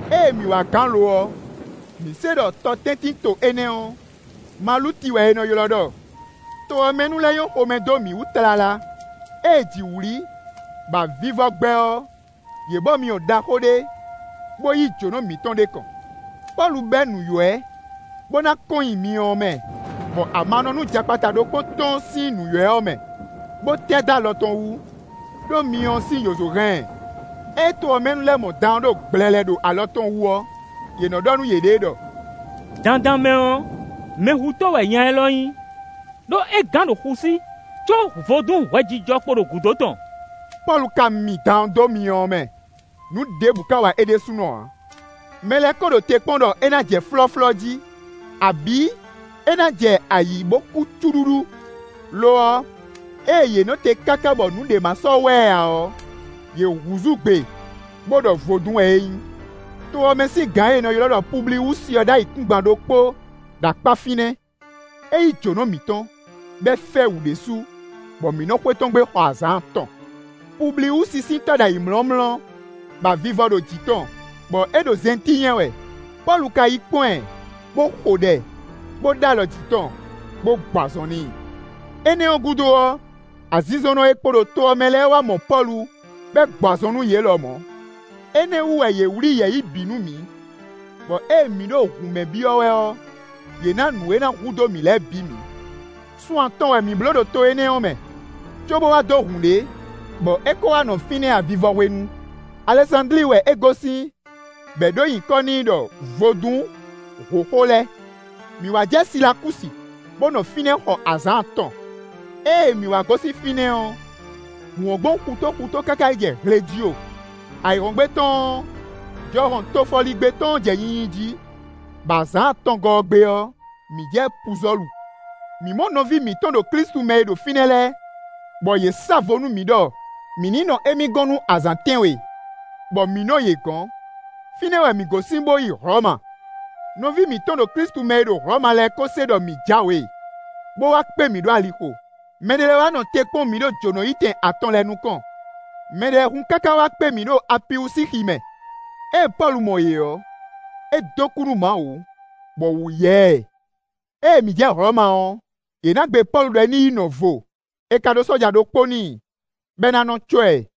Ée mǐ wá gán lo ɔ́, mǐ se ɖɔ tɔtɛ́ntinto énɛ́ ɔ́, Maluti wɛ è nɔ ylɔ́ ɖɔ. To ɔ́ mɛ nu lɛ́ɛ nyɔ́ xomɛ dó mǐ wú tlala. Ée jǐ wlí, bɔ avivɔ gbɛ́ ɔ́, yě bɔ myɔ ɖaxó ɖé, bó yí jǒnɔ mǐtɔn ɖ'é kɔn. Pɔ́lu bɛ́ nǔywɛ́, bó ná kɔn nyi myɔ ɔ́ mɛ, bɔ amanɔnú jakpata ɖokpó tɔ́n sín nǔywɛ́ ɔ́ mɛ, bó tɛ́ dó alɔ tɔn wú, ɖó myɔ ɔ́ sín yǒzo hɛn ɛ. Ée to ɔ́ mɛ nu lɛ́ɛ mɔ dan ɔ́ ɖo gblɛlɛ ɖo alɔ tɔn wú ɔ́, yě nɔ ɖɔ nú yěɖée ɖɔ: “Dandan mɛ ɔ́, mɛhutɔ́ wɛ nya élɔ́ nyí; ɖó é gán ɖo xu sí, có vodún hwɛjijɔ kpo ɖo gǔdo tɔn.” Pɔ́lu ka mi dan ɔ́ dó myɔ ɔ́ mɛ; nǔ ɖěbǔ ka wa é ɖésúnɔ ǎ. Mɛ lɛ́ɛ ko ɖo te kpɔ́n ɖɔ é ná jɛ flɔ́flɔ́ jí, abǐ é ná jɛ ayǐ bó kú cúɖúɖú; lo ɔ́, ée yě nɔ te káká bɔ nǔɖé ma sɔ́ wa ɛ ǎ ɔ́, yě húzú gbe bó ɖɔ vodún wɛ é nyí. To ɔ́ mɛ sín gǎn e è nɔ ylɔ́ ɖɔ Publiwúsi ɔ́ ɖó ayǐkúngban ɖokpó ɖo akpá fínɛ́. É yí jǒnɔ mǐtɔn, bɔ é fɛ́ wǔ ɖésú, bɔ mǐ nɔ xwé tɔn gbe xɔ azǎn atɔn. Publiwúsi sín tɔ́ ɖo ayǐmlɔ́mlɔ́, bɔ avivɔ ɖo jǐ tɔn, bɔ é ɖo zɛntín nyɛ wɛ. Pɔ́lu ka yi kpɔ́n ɛ, bó xo ɖɛ, bó ɖó alɔ jǐ tɔn, bó gbɔ azɔn n'i. Énɛ́ gúdo ɔ́, azinzɔnnɔ e kpo ɖo to ɔ́ mɛ lɛ́ɛ wá mɔ Pɔ́lu, bɔ é gbɔ azɔn nú yě lɔmɔ̌. Énɛ́ ɔ́ wú wɛ yě wlí yɛ̌yi bǐ nú mǐ, bɔ ée mǐ ɖo hǔn mɛ byɔ́ wɛ ɔ́, yě ná nǔ e ná hudó mǐ lɛ́ɛ bǐ mǐ. Sun atɔn wɛ mǐ bló ɖo to énɛ́ ɔ́ mɛ, cóbó wá dó hǔn ɖé, bɔ é ko wá nɔ fínɛ́ avivɔ hwenu; Alɛsándli wɛ é gosín, bɔ è ɖǒ nyǐkɔ n'i ɖɔ “Vodún hǒxo lɛ́ɛ.” Mǐ wá jɛ Silakúsi, bó nɔ fínɛ́ xɔ azǎn atɔn. Ée mǐ wá gosín fínɛ́ ɔ́, hǔn ɔ́ gbɔn xutó xutó káká yi jɛ Hlejio. Ayǐhɔ́ngbe tɔn ɔ́, jɔhɔn tofɔligbé tɔn ɔ́ jɛ nyinyi jí, bɔ azǎn atɔngɔ́ ɔ́ gbe ɔ́, mǐ jɛ Puzɔ́lu. Mǐ mɔ nɔví mǐtɔn ɖo Klísu mɛ e ɖo fínɛ́ lɛ́ɛ, bɔ yě sa vo nú mǐ ɖɔ mǐ ní nɔ émí gɔ́n nú azǎn tɛ́nwe, bɔ mǐ nɔ yě gɔ̌n. Fínɛ́ wɛ mǐ gosín bó yi Hlɔ̌ma. Nɔví mǐtɔn ɖo Klísu mɛ e ɖo Hlɔ̌ma lɛ́ɛ kó se ɖɔ mǐ jǎwe, bó wá kpé mǐ ɖo alixo; mɛɖé lɛ́ɛ wá nɔ te kpɔ́n mǐ ɖo Jǒnɔyítɛn Atɔn lɛ́ɛ nukɔn; mɛɖé lɛ́ɛ hun káká wá kpé mǐ ɖo Apiwúsixi mɛ. Ée Pɔ́lu mɔ yě ɔ́, é dó kú nú Mawu, bɔ wǔ yá ɛ. Ée mǐ jɛ Hlɔ̌ma ɔ́, è nǎ gbe Pɔ́lu ɖɔ ní yi nɔ vo; è ka ɖó sɔ́ja ɖokpó n'i, bɔ é ná nɔ cɔ́ ɛ.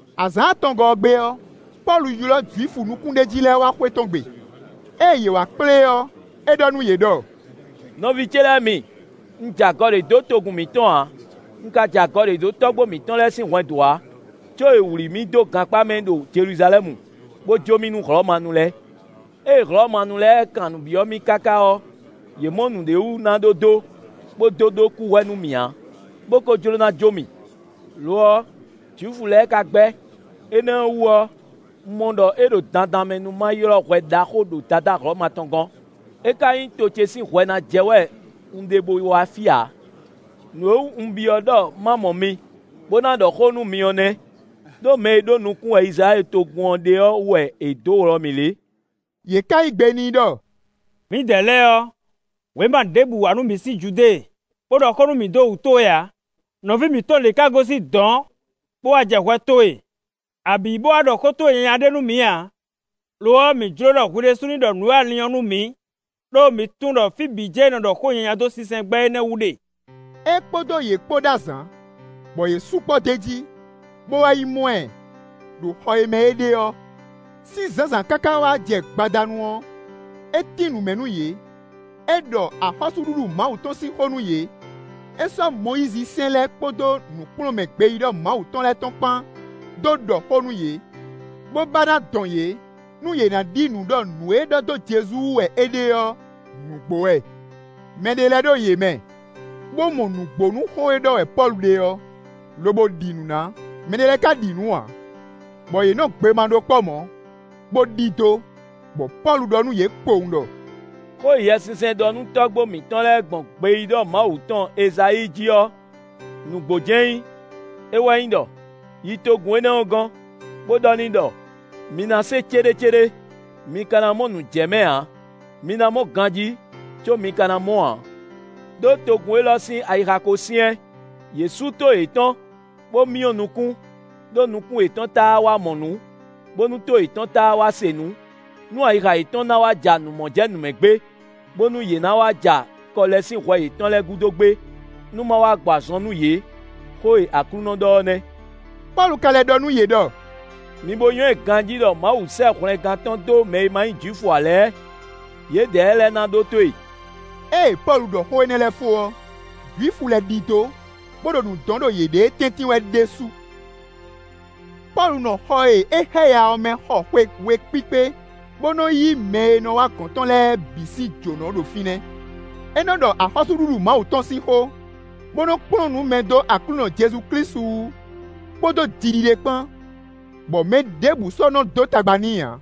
Azǎn atɔngɔ́ ɔ́ gbe ɔ́, Pɔ́lu ylɔ́ Jwifu nukúnɖéjí lɛ́ɛ wá xwé tɔn gbe. Ée yě wá kplé ɔ́, é ɖɔ nú yě ɖɔ: “Nɔví ce lɛ́ɛ mi, un jɛ agɔ ɖé dó togun mǐtɔn ǎ; un ka jɛ agɔ dó tɔ́gbó mǐtɔn lɛ́ɛ sín hwɛndo ǎ, có è wlǐ mì dó gankpá mɛ ɖo Jeluzalɛ́mu, bó jó mì nú Hlɔ̌manu lɛ́ɛ. Ée Hlɔ̌manu lɛ́ɛ kan nǔ byɔ́ mì káká ɔ́, yě mɔ nǔɖé wú ná ɖó dó, bó dó ɖó kúhwɛ nú mì ǎ, bó kó jló ná jó mì. Lo ɔ́, Jwifu lɛ́ɛ ka gbɛ́; énɛ́ ɔ́ wú ɔ́, un mɔ ɖɔ é ɖo dandan mɛ nú ma ylɔ́ hwɛ ɖaxó ɖo Dadá Hlɔ̌ma tɔn gɔ́n; é ka nyí to ce sín hwɛ ná jɛ wɛ un ɖe bo wá fí ǎ. Nǔ e wú un byɔ́ ɖɔ ma mɔ mi, bó ná ɖɔ xó nú mi ɔ́ nɛ́; ɖó mɛ e ɖó nukún wɛ Izlayɛ́li togun ɔ́ ɖe ɔ́ wú wɛ è dǒ wlɔ mì lě.” Yě ka yí gbe n'i ɖɔ: “Mǐdɛɛ lɛ́ɛ ɔ́, wěma ɖěbǔ wá nú mǐ sín Judée, bó ɖɔ xó nú mǐ dó wǔ towe ǎ; nɔví mǐtɔn ɖě ka gosín dɔ̌n, bó wá jɛ hwɛ towe, abǐ bó wá ɖɔ xó towe nyanya ɖé nú mǐ ǎ. Lo ɔ́, mǐ jló ɖɔ hwi ɖésú ní ɖɔ nǔ e a lin ɔ́ nú mǐ; ɖó mǐ tunwun ɖɔ fí bǐ jɛ́n è nɔ ɖɔ xó nyanya dó sinsɛngbɛ́ énɛ́ wú ɖe.” É kpódó yě kpó ɖó azǎn, bɔ yě sukpɔ́ d'é jí, bó wá yi mɔ ɛ, ɖo xɔ e mɛ é ɖe ɔ́. Sín zǎnzǎn káká wá jɛ gbadanu ɔ́, é tín nǔ mɛ nú yě. É ɖɔ axɔ́súɖuɖu Mawu tɔn sín xó nú yě; é sɔ́ Mɔyízi sɛ́n lɛ́ɛ kpódó nǔkplɔ́nmɛ gbeyíɖɔ Mawu tɔn lɛ́ɛ tɔn kpán dó ɖɔ xó nú yě, bó ba ná dɔn yě, nú yě na ɖi nǔ ɖɔ nǔ e ɖɔ dó Jezu wú wɛ é ɖe ɔ́ nǔgbó wɛ. Mɛ ɖé lɛ́ɛ ɖo yě mɛ, bó mɔ nǔgbó nú xó e ɖɔ wɛ Pɔ́lu ɖe ɔ́, lobo ɖi nǔ ná; mɛɖé lɛ́ɛ ka ɖi nǔ ǎ. Bɔ yě nɔ gbe ma ɖó kpɔ́ mɔ̌, bó ɖidó, bɔ Pɔ́lu ɖɔ nú yě kpowun ɖɔ: “Xó e Yɛsinsɛn ɖɔ nú tɔ́gbó mǐtɔn lɛ́ɛ gbɔn gbeyíɖɔ Mawu tɔn Ezayíi jí ɔ́, nǔgbó jɛ́n é nyí. É wɛ nyí ɖɔ: ‘Yi togun énɛ́ ɔ́ gɔ́n, bó ɖɔ n'i ɖɔ: mi ná se céɖécéɖé, mi ka ná mɔ nǔ jɛ mɛ ǎ; mi ná mɔ ganjí có mi ka ná mɔ ǎ. Đó togun élɔ́ sín ayixa ko syɛ́n; yě sú tó yětɔn, bó myɔ nukún, ɖó nukún yětɔn táá wá mɔ nǔ, bónú tó yětɔn táá wá se nǔ, nú ayixa yětɔn ná wá ja nǔ mɔ jɛ nǔ mɛ gbé, bónú yě ná wá ja kɔ lɛ́ sín hwɛ yětɔn lɛ́ɛ gúdo gbé, nú ma wá gbɔ azɔn nú yě. Xó e Aklúnɔ ɖɔ ɔ́ nɛ́.’” Pɔ́lu ka lɛ́ ɖɔ nú yě ɖɔ: “Mi bo nywɛ́ ganjí ɖɔ Mawu sɛ́ hwlɛngán tɔn dó mɛ e ma nyí Jwifu ǎ lɛ́ɛ; yědɛɛ lɛ́ɛ ná ɖótó e.” [ Ée Pɔ́lu ɖɔ xó énɛ́ lɛ́ɛ fó ɔ́, Jwifu lɛ́ɛ ɖidó, bó ɖo nǔ dɔn ɖo yěɖée tɛ́ntin wɛ ɖésú.] Pɔ́lu nɔ xɔ e é xáya ɔ́ mɛ xɔ xwe we kpíkpé, bó nɔ́ yí mɛ e nɔ wá gɔ̌n tɔn lɛ́ɛ bǐ sín jǒnɔ ɖo fínɛ́. É nɔ ɖɔ axɔ́súɖuɖu Mawu tɔn sín xó, bó nɔ́ kplɔ́n nǔ mɛ dó Aklúnɔ Jezu Klísu wú, kpódó jiɖiɖe kpán, bɔ mɛ ɖěbǔ sɔ́ nɔ́ dó tagba n'i ǎ.